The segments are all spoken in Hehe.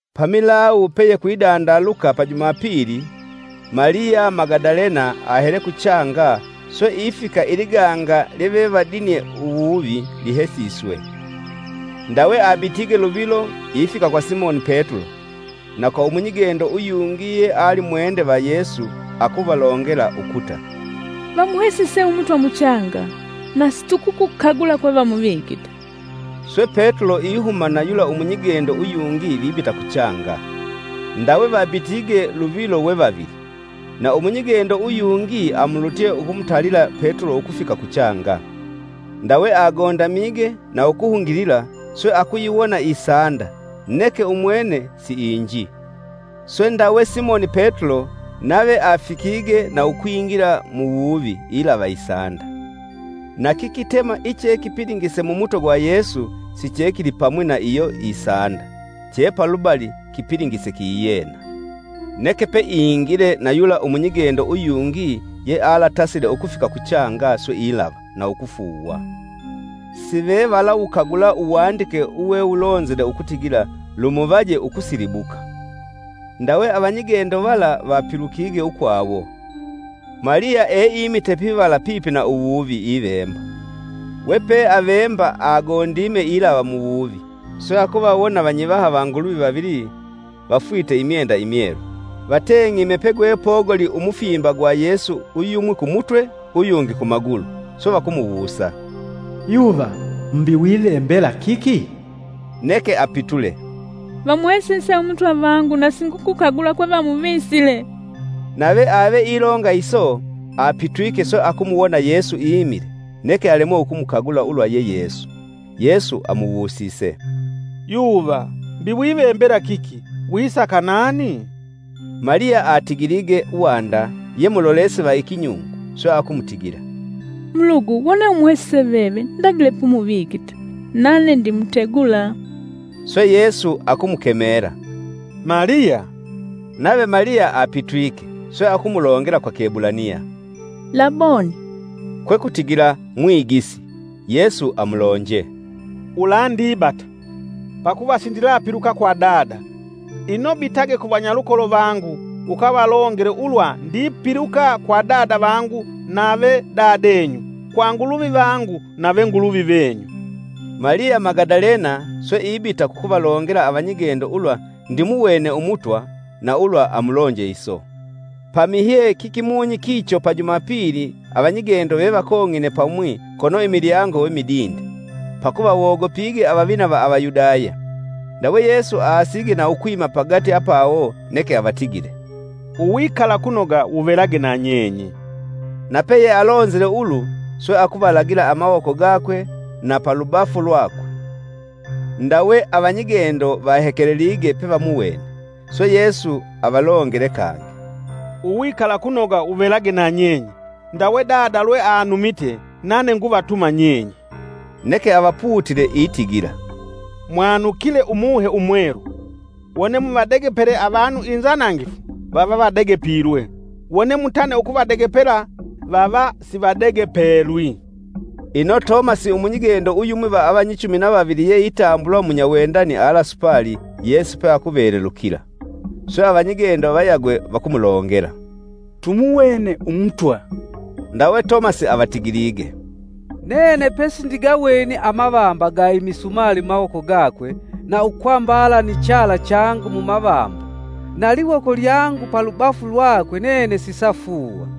Pamilawu peyekwindaluka pa Jumapili, Maliya Magadalena ahele kuchanga swe ifika iliganga lyevevadinye uwuvi lihesiswe. Ndawe abitige luvilo ifika kwa Simoni Petulo na kwa umunyigendo uyungi yealimwende va Yesu akuvalongela ukuta, “Vamuhesise Umutwa muchanga, na situkukukagula kwe vamuvikite.” Swe Petulo ihuma na yula umunyigendo uyungi vibita kuchanga. Ndawe vabitige luvilo we vavili, na umunyigendo uyungi amulutye akumutalila Petulo ukufika kuchanga. Ndawe agondamige na ukuhungilila swe akuyiwona isanda, neke umwene siinji. Swe ndawe Simoni Petulo, nave afikige na ukwingila muwuvi ilava isanda. Na kikitema ichekipilingise Mumutwe gwa Yesu, sichekilipamwi na iyo isanda, chepalubali kipilingise kiyena. Neke peingile, na yula umunyigendo uyungi yealatasile ukufika kuchanga swe ilava, na ukufuuwa. ( Sivevalawukagula Uwandike uwewulonzile ukutigila, lumuvaje ukusilibuka.) Ndawe avanyigendo vala vapilukige ukwawo. Maliya eimite pivala pipi na uwuvi ivemba. Wepeavemba agondime ilava muwuvi, swe akuvawona Vanyivaha va Nguluvi vavili vafwite imyenda imyelu vateng'ime pegwepogoli umufimba gwa Yesu uyumwi kumutwe uyungi kumagulu. Swe vakumuwusa, “Yuva, mbi wivembela kiki?” Neke apitule, “Vamuhesise Umutwa vangu na singukukagula kwe vamuvisile!” Nave ave ilonga iso apitwike swe akumuwona Yesu imile neke alemwe ukumukagula ulwa ye Yesu. Yesu amuwusise, “Yuva, mbi wivembela kiki? wisaka nani?” Maliya atigilige wanda ye mulolesi va ikinyungu, swe akumutigila, “Mulugu wone umuhesise veve ndagile pumuvikite, nane ndimutegula.” Swe Yesu akumukemela, “Maliya!” nave Maliya apitwike, swe akumulongela kwa Kiebulaniya, “Laboni.” Kwekutigila, “Mwigisi.” Yesu amulonje, “Ulandibata, pakuva sindilapiluka kwa Dada. Ino bitage ku vanyalukolo vangu ukavalongele ulwa ndipiluka kwa Dada vangu nave Dadenyu kwa Nguluvi vangu nave Nguluvi venyu.” Maliya Magadalena swe ibita kukuvalongela avanyigendo ulwa ndimuwene Umutwa na ulwa amulonje iso. Pamihye kikimunyi kicho pa Jumapili avanyigendo vevakong'ine pamwi kono imilyango we midinde, pakuva wogopige avavina va Avayudaya. Ndawe Yesu aasige na ukwima pagati apawo neke avatigile, “Uwikalakunoga wuvelage na nyenye!” Na peyealonzile ulu swe akuvalagila amawoko gakwe na palubafu lwakwe. Ndawe avanyigendo vahekelelige pevamuwene. Swe Yesu avalongele kangi, “Uwikalakunoga wuvelage na nyenye! Ndawe Dada lweanumite nane nguvatuma nyenye.” Neke avaputile itigila, “Mwanukile Umuhe Umwelu. Wone muvadegepele avanu inzanangifu, vava vadegepilwe, wone mutane ukuvadegepela, vava sivadegepelwi.” Ino Tomasi umunyigendo uyumwi va avanyichumi na vavili yeitambulwa munyawendani alasupali, Yesu peakuvelelukila. Swe avanyigendo vayagwe vakumulongela, “Tumuwene Umutwa.” Ndawe Tomasi avatigilige, “Nene pesindigaweni amavamba ga imisumali mumawoko gakwe na ukwambala ni chala changu mumavamba, na liwoko lyangu palubafu lwakwe nene sisafuuwa.”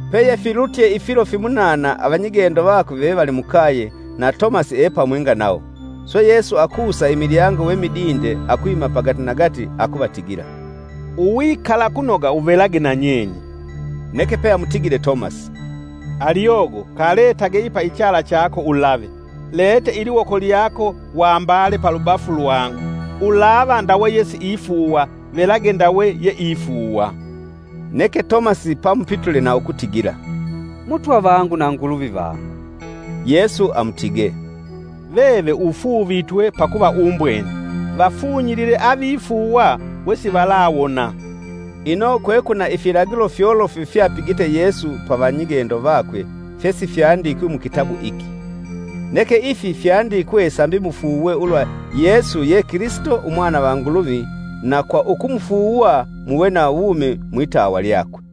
Peyefilutye ifilo fimunana avanyigendo vakwe vevali mukaye na Tomasi epamwinga nawo. Swe Yesu akusa imilyango we midinde akwima pagati nagati akuvatigila, “Uwikalakunoga wuvelage na nyenye!” Neke peamutigile Tomasi, “Aliogo kaletage ipa ichala chako ulave, lete iliwoko lyako wambale palubafu lwangu. Ulava ndawe yesiifuuwa, velage ndawe yeifuuwa!” Neke Tomasi pamupitule na ukutigila, “Mutwa vangu na Nguluvi vangu!” Yesu amutige, “Veve ufuuvitwe pakuva umbwene, vafunyilile avifuuwa wesivalawona!” Ino kwekwina ifilagilo fyolofu fyapigite Yesu pa avanyigendo vakwe fyesifyandikwi mukitabu iki. Neke ifi fyandikwe sambi mufuuwe ulwa Yesu ye Kilisito Umwana va Nguluvi na kwa ukumufuuwa muve na wumi mwitawa lyakwe.